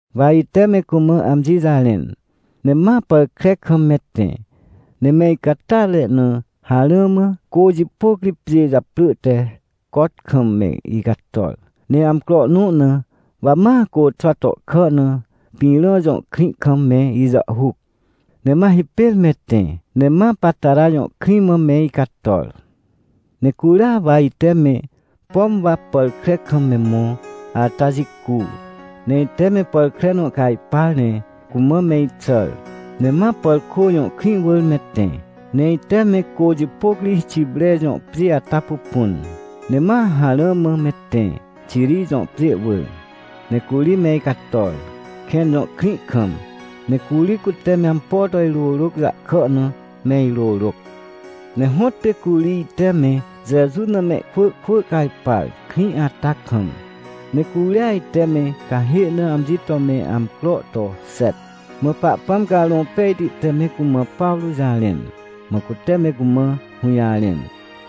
Wa ite me cumã amji jarẽn, ne ma pàr kre kam me tẽ, ne me icatyatre na harã mã, cô jipôc ri pjê japrỳ te Cot kam me icator. Ne amcro nõ na, wa ma côxwa tohkà na Pĩrã jõ krĩ kam me ijàhhuc, ne ma hipêr me tẽ, ne ma Patara jõ krĩ mã me icator. Ne curia wa ite me, pom wa pàr kre kam me mõ ata jicu, ne ite me pàr kre nõ cajpar, ne cumã me ixàr, ne ma Pàrkô jõ krĩ wỳr me tẽ. Ne ite me cô jipôc ri Xipre jõ pjê ata pupun, ne ma harã mã me tẽ, Xiri jõ pjê wỳr. Ne curi me icator, Kẽn jõ krĩ kam, ne curi cute me ampo to irôrôc jahkà na me irôrôc. Ne hõtpê curi ite me Jeju na mehkwỳ kwỳ cajpar, krĩ ata kam, ne curia ite me cahê na amji to me amcro to xet. Mã Pahpãm Carõ Pejti te me cumã Pawrô jarẽn, mã cute me cumã hũjarẽn,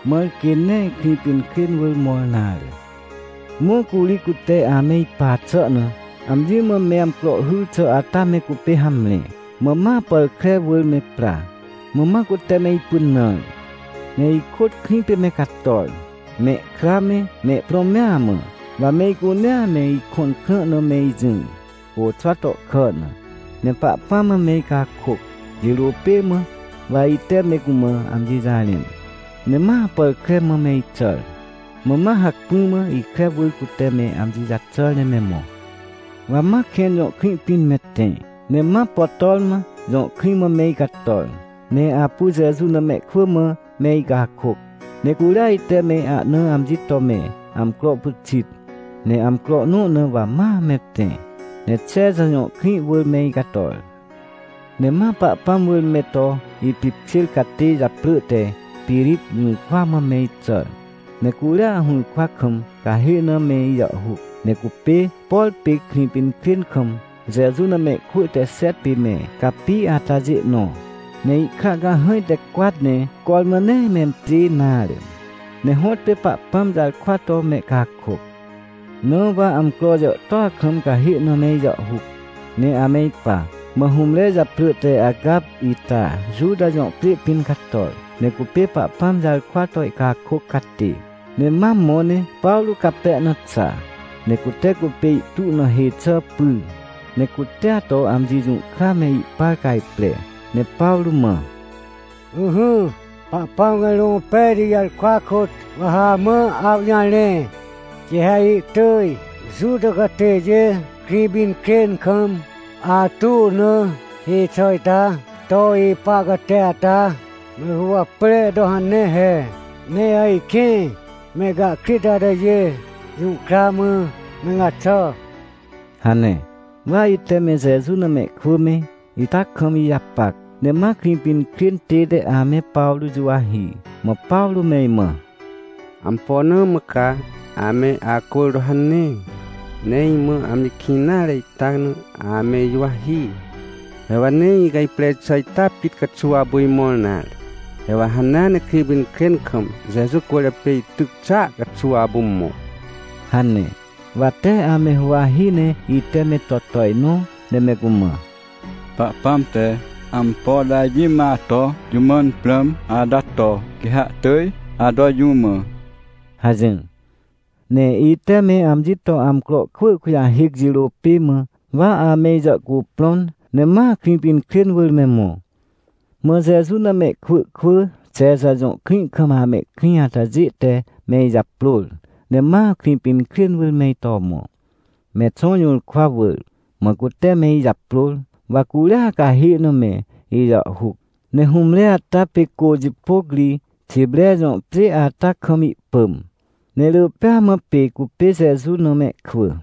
mãr quê nee Krĩpinkrên wỳr mõr nare. Mã curi cute ame ipa xà na, amji mã me amcro hyr xà ata me cupê hamre, mã ma pàr kre wỳr me pra. Mã ma cute me ipynãr, ne ikôt krĩ pê me cator, mehkra me, mehprõ mea mã. Wa me icunea me ikõn krã na me ijỹr, côxwa tohkà na, ne Pahpãm mã me icakôc. Jirô pê mã wa ite me cumã amji jarẽn, ne ma pàr kre mã me ixàr. Mã ma hacpỹ mã ikre wỳr cute me amji jaxàr ne me mõ. Wa ma Kẽn jõ krĩ pĩn me tẽ, ne ma Potorma jõ krĩ mã me icator, ne apu Jeju na mehkwỳ mã me icakôc, ne curia ite me ahna amji to me amcro pyxit. Ne amcro nõ na wa ma me tẽ, ne Xexa jõ krĩ wỳr me icator. Ne ma Pahpãm wỳr me to ipipkjêr catê japrỳ te Pirip jũrkwa mã me ixàr, ne curia hũrkwa kam cahê na me ijàhhuc. Ne cupê, por pê Krĩpinkrên kam Jeju na mehkwỳ te xet pê me capi atajê nõ. Ne ihkra cahãj te cwat ne cormã nee mempjê nare, ne hõtpê Pahpãm jarkwa to mehcakôc. Na wa amcro jàhtôa kam cahê na me ijàhhuc, ne ame ipa. Mã hũmre japrỳ te Agap ita Juta jõ pjê pĩn cator. Ne cupê Pahpãm jarkwa to ihcakôc catê. Ne ma mõ ne Pawrô cape na xa, ne cute cupê ihtu na hê xà pyr, ne cutea to amji jũhkra me ihpar cajpre, ne Pawrô mã: — Ỹhỹ, Pahpãm Carõ Pejti jarkwa kôt wa ha amã awjarẽ. Quê ha ihtỳj Juta catêjê Krĩpinkrên kam, atu na hê xà ita to ipa catê ata me guwapre to hanea he, ne ajkĩ mehcahkrit atajê jũhkra mã me gaxà — hane. Wa ite me Jeju na mehkwỳ me, ita kam ijapac, ne ma Krĩpinkrên tête ame Pawrô juwahi. Mã Pawrô me imã: — Ampo na mã ca ame acwỳr to hane, ne imã amji kĩn nare ita na ame ijuwahi? He wa nee icajpre xà ita pit caxuw apu imõr nare. He wa hanea ne Krĩpinkrên kam, Jeju cwỳrjapê ityc xàa caxuw apu mõ — hane. Wa tee ame huwahi, ne ite me to tojnõ ne me cumã: — Pahpãm te ampo to amji mã ato jũ mãn prãm ata to, quê ha ihtỳj ato jũ mã — hajỹr. Ne ite me amji to amcro kwỳ kujahêc jirô pê mã, wa ame ijàhcuprõn, ne ma Krĩpinkrên wỳr me mõ. Mã Jeju na mehkwỳ kwỳ Xexa jõ krĩ kam amehkrĩ atajê te me ijaprôr, ne ma Krĩpinkrên wỳr me ito mõ, Mexõ jũrkwa wỳr. Mã cute me ijaprôr, wa curia cahê na me ijàhhuc. Ne hũmre ata pê cô jipôc ri, Xipre jõ pjê ata kam ihpỳm. Ne rỳ pêa mã pê cupê Jeju na mehkwỳ.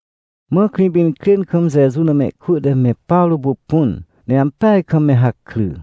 Mã Krĩpinkrên kam Jeju na mehkwỳ te me Pawrô pupun, ne ampeaj kam me hakry.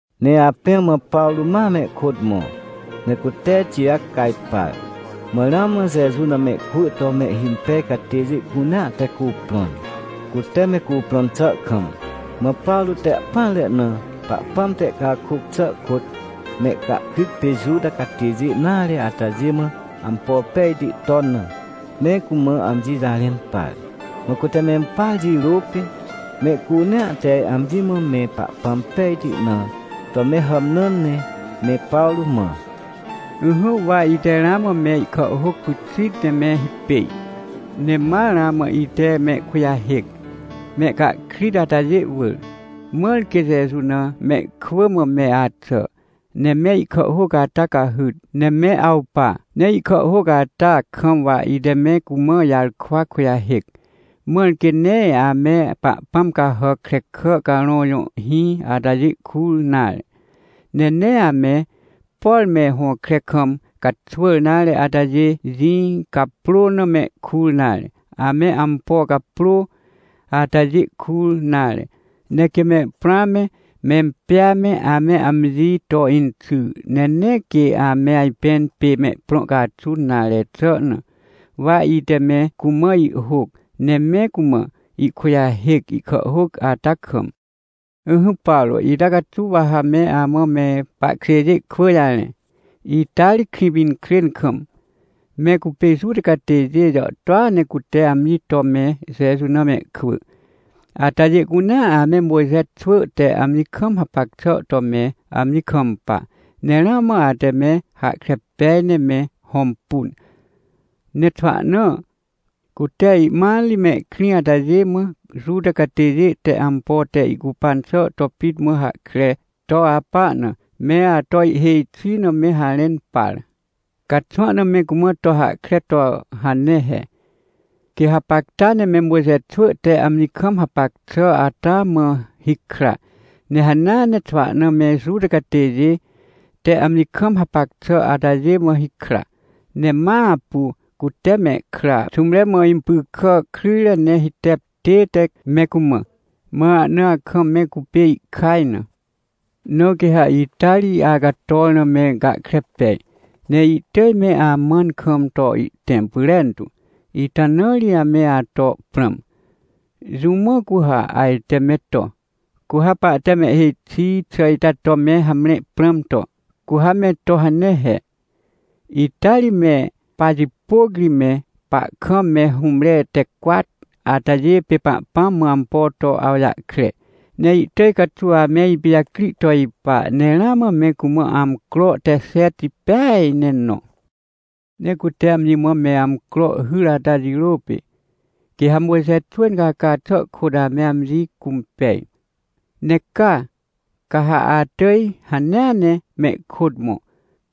Ne apẽ mã Pawrô ma me ikôt mõ, ne cute Tijac cajpar. Mã ramã Jeju na mehkwỳ to mehhimpej catêjê cunea te cuprõn, cute me cuprõn xà kam. Mã Pawrô te ahpỹanre na, Pahpãm te ihcakôc xà kôt mehcahkrit pê Juta catêjê nare atajê mã ampo pejti ton na, me cumã amji jarẽn par. Mã cute mempar jirô pê, mehcunea te amji mã me Pahpãm pejti na to me hàmnãn, ne me Pawrô mã: — Ỹhỹ, wa ite ramã me ihkàhhôc pyxit ne me hipêj, ne ma ramã ite mehkujahêc, mehcahkrit atajê wỳr. Mãr quê Jeju na mehkwỳ mã me axà, ne me ihkàhhôc ata cahyt, ne me awpa. Ne ihkàhhôc ata kam wa ite me cumã ijarkwa kujahêc, mãr quê nee ame pahpãm cahàc krekà carõ jõ hĩ atajê kur nare. Ne nee ame, por me hõkre kam caxwỳr nare atajê jĩ caprô na mehkur nare, ame ampo caprô atajê kur nare. Ne quê mehprõa me, mempjêa me, ame amji to inxy, ne nee quê ame ajpẽn pê mehprõ caxun nare xà na, wa ite me cumã ihhôc ne me cumã ihkujahêc, ihkàhhôc ata kam. Ỹhỹ, Pawrô, ita caxuw wa ha me amã me pahkjêjê kwỳ jarẽ. Ita ri Krĩpinkrên kam, me cupê Juta catêjê jàhtôa ne cute amji to me Jeju na mehkwỳ. Atajê cunea ame Mojxe xwỳ te amji kam hapac xà to me amji kampa, ne ramã ate me hahkre pej ne me hõmpun. Ne xwahna, cute ihmat ri, mehkrĩ atajê mã Juta catêjê te ampo te ihcupan xà to pit mã hahkre to apa na, me ato ihhêj xi na me harẽn par. Ca xwahna me cumã to hahkre to hane he, quê hapacta ne me Mojxe xwỳ te amji kam hapac xà ata mã hikra, ne hanea ne xwahna me Juta catêjê te amji kam hapac xà atajê mã hikra, ne ma apu cute mehkra xũmre mã impy kà kryjre ne hitep tête me cumã. Mã ahna akam me cupê ihkaj na. Na quê ha ita ri acator na me gahkre pej, ne ihtỳj me amãn kam to ihtẽm pyrentu. Ita na ri me ato prãm. Jũ mã cu ha ajte me to? Cu ha pahte mehhêj xi xà ita to me hamre prãm to, cu ha me to hane he. Ita ri me pajipôc ri, me pahkam me hũmre te cwat atajê, pê Pahpãm mã ampo to awjahkre. Ne ihtỳj caxuw ame ipijacri to ipa. Ne ramã me cumã amcro te xet peaj ne nõ. Ne cute amji mã me amcro hyr ata jirô pê, quê ha Mojxe xwỳ incaca xà kôt ame amji cũmpej. Ne caa, ca ha atỳj hanea ne mehkôt mõ,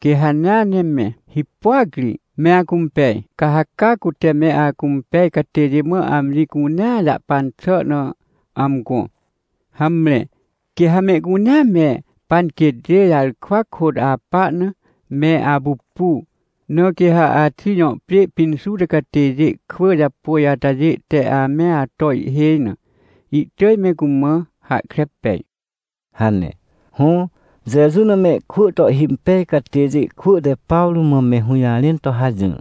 quê hanea ne me hipôac ri me acũmpej, ca ha caa cute me acũmpej catêjê mã amji cunea jahpan xà na amgõ. Hamre, quê ha mehcunea me panquêtjê jarkwa kôt apa na me apupu. Na quê ha Axij jõ pjê pĩn Juta catêjê kwỳ japôj atajê te ame ato ihhêj na, ihtỳj me cumã hahkre pej — hane. Hõ, Jeju na mehkwỳ to ihhimpej catêjê kwỳ te Pawrô mã me hũjarẽn to hajỹr.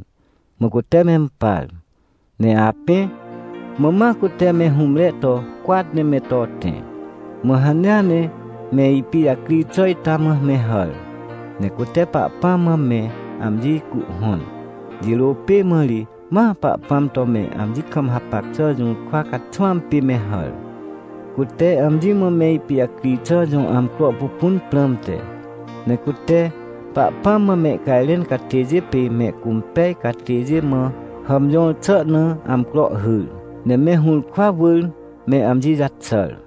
Mã cute mempar. Ne apẽ, mã ma cute me hũmre to cwat ne me to tẽ, mã hanea ne me ipijacri xà ita mã me hàr, ne cute Pahpãm mã me amji cuhhõn. Jirô pê mã ri ma Pahpãm to me amji kam hapac xà jũrkwa caxwãm pê me hàr. Cute amji mã me ipijacri xà jõ amcro pupun prãmte. Ne cute Pahpãm mã mehcajrẽn catêjê pê mehcũmpej catêjê mã hàmjõr xà na amcro hyr, ne me hũrkwa wỳr me amji jaxàr.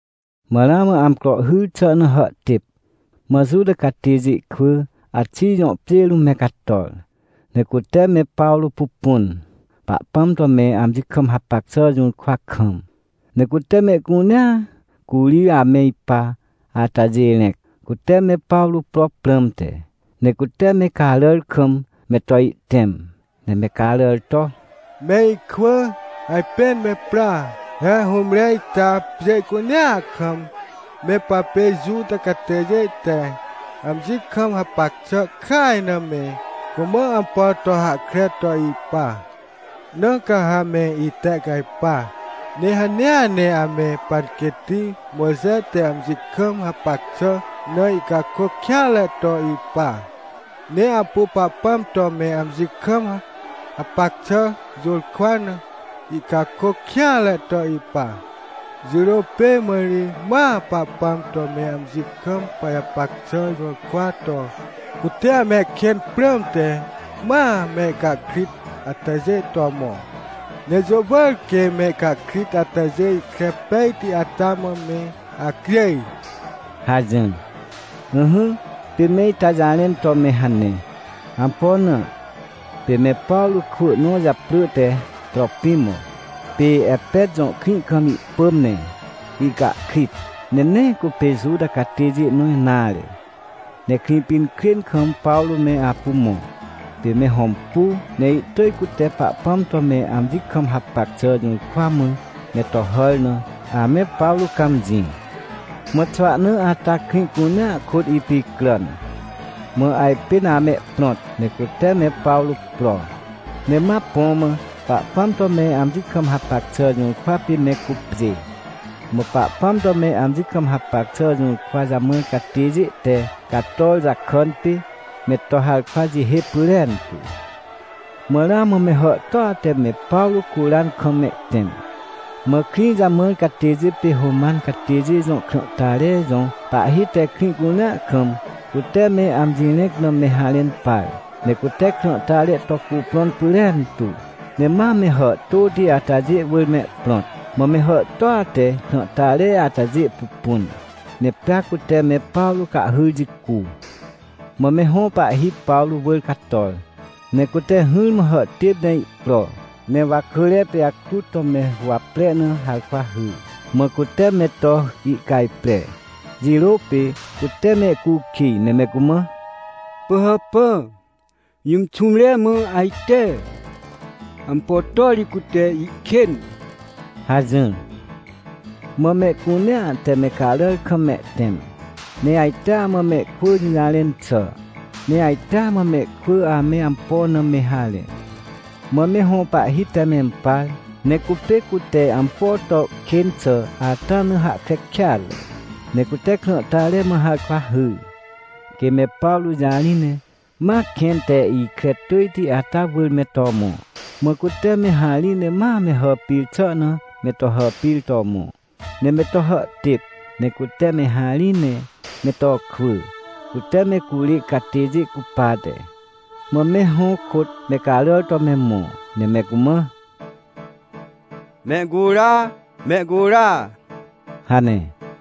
Mã ramã amcro hyr xà na hàhtêp. Mã Juta catêjê kwỳ Axij jõ pjê rũm me cator, ne cute me Pawrô pupun, Pahpãm to me amji kam hapac xà jũrkwa kam. Ne cute mehcunea curi ame ipa atajê rẽc, cute me Pawrô pro prãmte. Ne cute me caràr kam me to ihtẽm, ne me caràr to: — Me ikwỳ! Ajpên me pra! He hũmre ita pjê cunea kam, me papê Juta catêjê te amji kam hapac xà kaj na me cumã ampo to hahkre to ipa! Na ca ha me itehcajpa! Ne hanea ne ame panquêtti Mojxe te amji kam hapac xà na ihcakôc kêanre to ipa, ne apu Pahpãm to me amji kam hapac xà jũrkwa na ihcakôc kêanre to ipa. Jirô pê mã ri ma Pahpãm to me amji kam pajapac xà jũrkwa to cute amehkên prãmte, ma mehcahkrit atajê to mõ. Ne jũ wỳr quê mehcahkrit atajê ikre pejti ata mã me acjêj — hajỹr. Ỹhỹ, pê me ita jarẽn to me hane. Ampo na? Pê me Pawrô kwỳ nõ japrỳ te Tropimo, pê Epet jõ krĩ kam ihpỳm, ne ihcahkrit, ne nee cupê Juta catêjê nõ nare, ne Krĩpinkrên kam Pawrô me apu mõ. Pê me hõmpu, ne ihtỳj cute Pahpãm to me amji kam hapac xà jũrkwa mã me to hàr na ame Pawrô cãmjĩ. Mã xwahna ata krĩ cunea kôt ipicràn, mã ajpên amehprõt, ne cute me Pawrô pro, ne ma põ mã Pahpãm to me amji kam hapac xà jũrkwa pê me cupjê. Mã Pahpãm to me amji kam hapac xà jũrkwa jamãr catêjê te cator jakàn pê, me to harkwa jihê pyrentu. Mã ramã me hàhtôa te me Pawrô curan kam mehtẽm. Mã krĩ jamãr catêjê pê Roman catêjê jõ krãhtare jõ pahhi te krĩ cunea kam, cute me amji rẽc na me harẽn par. Ne cute krãhtare to cuprõn pyrentu, ne ma me hàhtôti atajê wỳr mehprõt. Mã me hàhtôa te krãhtare atajê pupun, ne pea cute me Pawrô cahhyr jicu. Mã me hõ pahhi Pawrô wỳr cator, ne cute hỹrmã hàhtêp ne ihpro, ne wakỳre pijakrut to me huwapre na harkwa hyr, mã cute me to ihcajpre. Jirô pê cute mehcukij, ne me cumã: — Pỳhàpà, jũm xũmre mã ajte? Ampo to ri cute ihkên? — hajỹr. Mã mehcunea te me caràr kam mehtẽm, ne ajtea mã mehkwỳ jũjarẽn xà, ne ajtea mã mehkwỳ ame ampo na me harẽ. Mã me hõ pahhi te mempar, ne cupê cute ampo to kên xà ata na hahkre kêatre. Ne cute krãhtare mã harkwa hyr, quê me Pawrô jarĩ ne ma kẽn te ikre tỳjti ata wỳr me to mõ. Mã cute me harĩ ne ma me hàpir xà na me to hàpir to mõ, ne me to hàhtêp, ne cute me harĩ ne me to kwỳ, cute me curê catêjê cupate. Mã me hõ kôt me caràr to me mõ, ne me cumã: — Mehcura! Mehcura! — hane.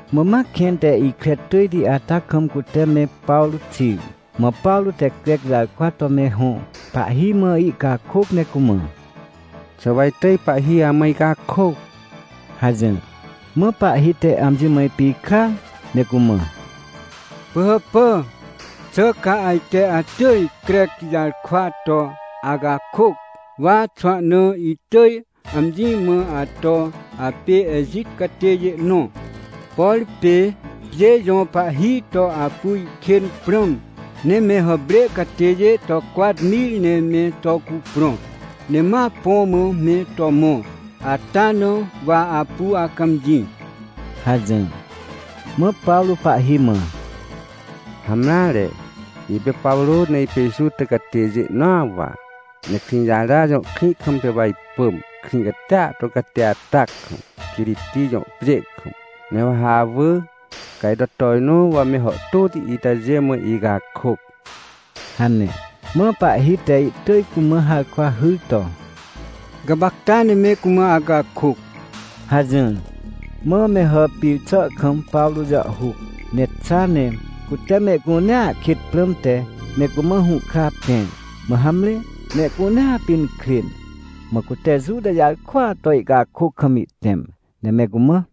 Mã ma kẽn te ikre tỳjti ata kam cute me Pawrô xir. Mã Pawrô te Crec jarkwa to me hõ pahhi mã ihcakôc ne cumã: — Xà wa itỳj pahhi amã icakôc? — hajỹr. Mã pahhi te amji mã ipikrar, ne cumã: — Pỳhàpà, xà ca ajte atỳj Crec jarkwa to acakôc? Wa xwahna itỳj amji mã ato apê Ejit catêjê nõ. Por pê pjê jõ pahhi to apu ihkên prãm, ne me hàprê catêjê to cwat mir ne me to cuprõ, ne ma põ mã me to mõ ata na wa apu acãmjĩ — hajỹr. Mã Pawrô pahhi mã: — Hamreare, ipê Pawrô, ne ipê Juta catêjê nõa wa, ne Krĩjara jõ krĩ kam pê wa ipỳm, krĩ catia to cati ata kam, Quiriti jõ pjê kam. Ne wa ha awỳ, ca ito tojnõ wa me hàhtôti itajê mã icakôc — hane. Mã pahhi te ihtỳj cumã harkwa hyr to: — Gapacta ne me cumã acakôc — hajỹr. Mã me hàpir xà kam Pawrô jàhhuc, ne xa, ne cute mehcunea kêt prãmte me cumã hũhkra pẽr. Mã hamre, mehcunea pinkrên. Mã cute Juta jarkwaa to ihcakôc kam ihtẽm, ne me cumã: